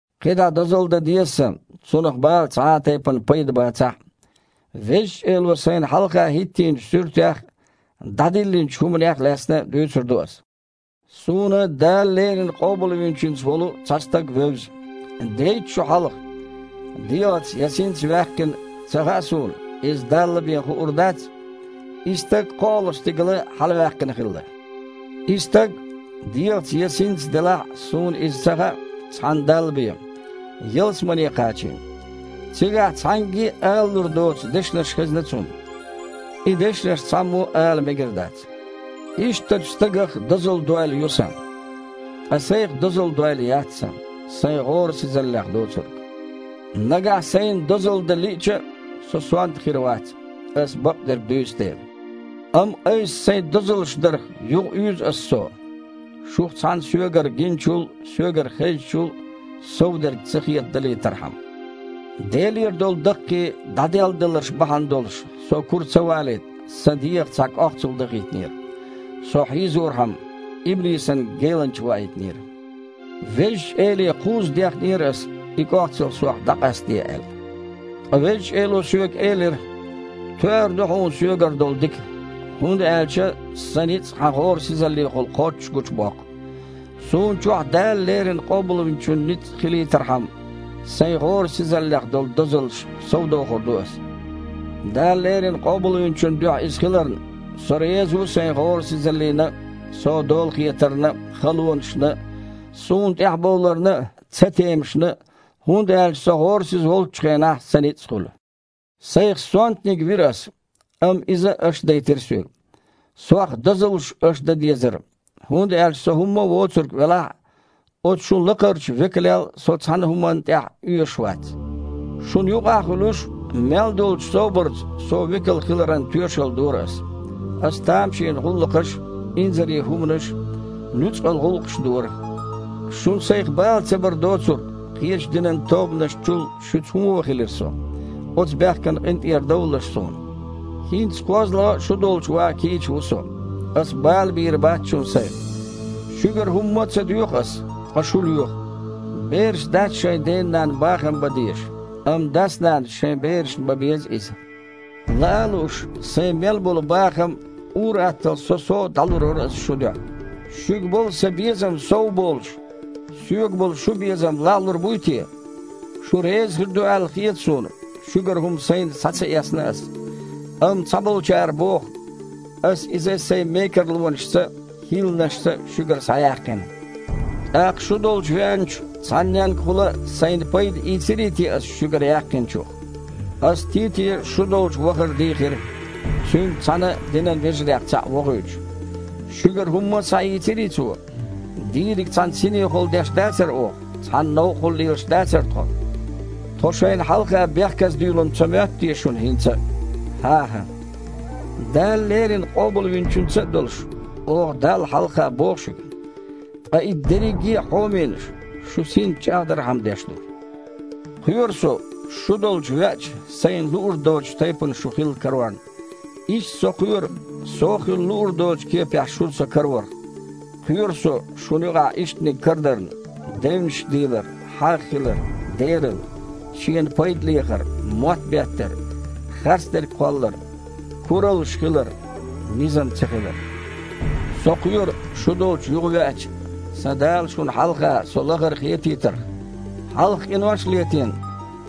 КхидІа дозалла дан деза сан, цунах бала цхьа а тайпана пайда бацахь а. Везачу Эло сайна хьалха хІиттийначу суьртех а, дІадиллинчу хІуманех а лаьцна дуьйцур ду аса. Суна Дала леррина Къобалвинчуьнца волу цхьа стаг вевза. Дейтта шо хьалха, (дегІаца я синца ваьккхина ца хаьа суна, иза Далла бен хуур дац) и стаг кхоалгІачу стигала хьалаваьккхина хилла. И стаг, (дегІаца я синца делахь а, суна иза ца хаьа, цхьана Далла бен) ялсамане кхачийна. Цигахь цхьаьнгге а алалур доцу дешнаш хезна цунна. И дешнаш цхьаммо а ала мегар дац. Ишттачу стагах дозалла дойла ю сан. Ткъа сайх дозалла дойла яц сан, сайн гІорасизаллех доцург. Нагахь сайна дозалла дан лиъча а, со сонта хир вац, аса бакъдерг дуьйцу дела. Амма айса сайх дозаллаш дарх юхауьйзу аса со, шух цхьанна соьгара гиначул а, соьгара хезначул а совдерг ца хетадалийтархьама. Делера долу даккхий дІаделладаларш бахьана долуш со кура ца валийта, сан дегІах цхьа кІохцал дахийтинера: со хьийзорхьама, иблисан геланча ваийтинера! Везачу Эле кхузза дехнера аса, и кІохцал сох дІакъастаде аьлла. Ткъа Везачу Эло соьга элира: «Тоьар ду хьуна Соьгара долу дика, хІунда аьлча Сан ницкъ хьан гІорасизаллехула кхоччуш гучубоккху». Суна чохь Дала леррина Къобалвинчун ницкъ хилийтархьама, сайн гІорасизаллех долу дозаллаш совдохур ду аса. Дала леррина Къобалвинчун дуьхьа иза хиларна, со реза ву сайн гІорасизаллина а, со дола хетарна а, халонашна а, суна тІаьхьабовларна а, цатемашна а, хІунда аьлча со гІорасиза волччу хенахь сан ницкъ а хуьлу. Сайх сонтаниг вира аса, амма иза аша дайтира соьга. Сох дозаллаш аша дан дезара, хІунда аьлча со хІумма а воцург велахь а, оцу шун «лакхарчу векалел» со цхьана а хІуманна тІехь а оьшуш вац. Шуна юкъахь а хуьлуш, мел долчу собарца со векал хиларан тоьшалла дора ас: аса тамашийна гІуллакхаш а, инзаре хІуманаш а, нуьцкъала гІуллакхаш а дора. Шуна сайх бала ца бар доцург, кхечу динан тобанашца чул шуьца хІун вон хилира со? Оцу бехкана къинтІерадовлалаш суна. ХІинца кхозлагІа а шу долчу ван кийча ву со. Аса бала бийр бац шуна сайх. Шуьгара хІумма а ца доьху аса, ткъа шу лоьху. Бераш дац шайн дена-нанна бахам бан дезаш, амма дас-нанас шайн берашна бан беза иза. Лаа а лууш, сайн мел болу бахам а, ур-атталла со-со а дІалур вара ас шун дуьхьа. Шуьга болу сан безам сов а болуш, соьга болу шун безам лагІлур буй те? Шу реза хир ду аьлла хета суна, шуьгара хІума сайна схьа ца эцна ас. Амма цхьаболчара боху, аса иза сайн мекарлонашца а, хІилланашца а шуьгара схьаяьккхина. ТІаккха шу долчу веанчу цхьанненгахула а сайна пайда ийцирий те аса шуьгара яьккхинчух? Аса Тите шу долчу вахар дийхира, цуьнца цхьаьна динан вежарех цхьаъ вохуьйтуш. Шуьгара хІумма а схьаийцирий цо? Дийриг цхьана синехула деш дацара оха, цхьана новкъахула лелаш дацара тхо? Тхо шайна хьалха бехказадуьйлу-м ца моьтту те шуна хІинца а? ХІан-хІа! Дала леррина Къобалвинчуьнца а долуш, оха Далла хьалха боху шуьга. Ткъа и дерриге а, хьоменаш, шу синца чІагІдархьама деш ду. Кхоьру со, шу долчу веача, сайна луур доцучу тайпана шу хилла карорна. Иштта со кхоьру, со хила луур доцучу кепехь шуна со караварх. Кхоьру со, шуна юкъахь ишттаниг карадарна: девнаш дийлар, хьагІ хилар, дералла, шена пайда лехар, мотт беттар, харцдерг кхоллар, кураллаш хилар, низам цахилар. Со кхоьру, шу долчу юхавеача, сан Дала шуна хьалха со лахара хетийтарх. Хьалха къинош а летийна,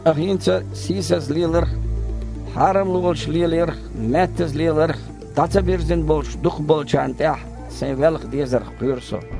ткъа хІинца а сийсаза леларх а, хьарамлонаш лелаярх а, меттаза леларх а дІа ца бирзина болчу дукхахболчарна тІехь сайн велха дезарх кхоьру со.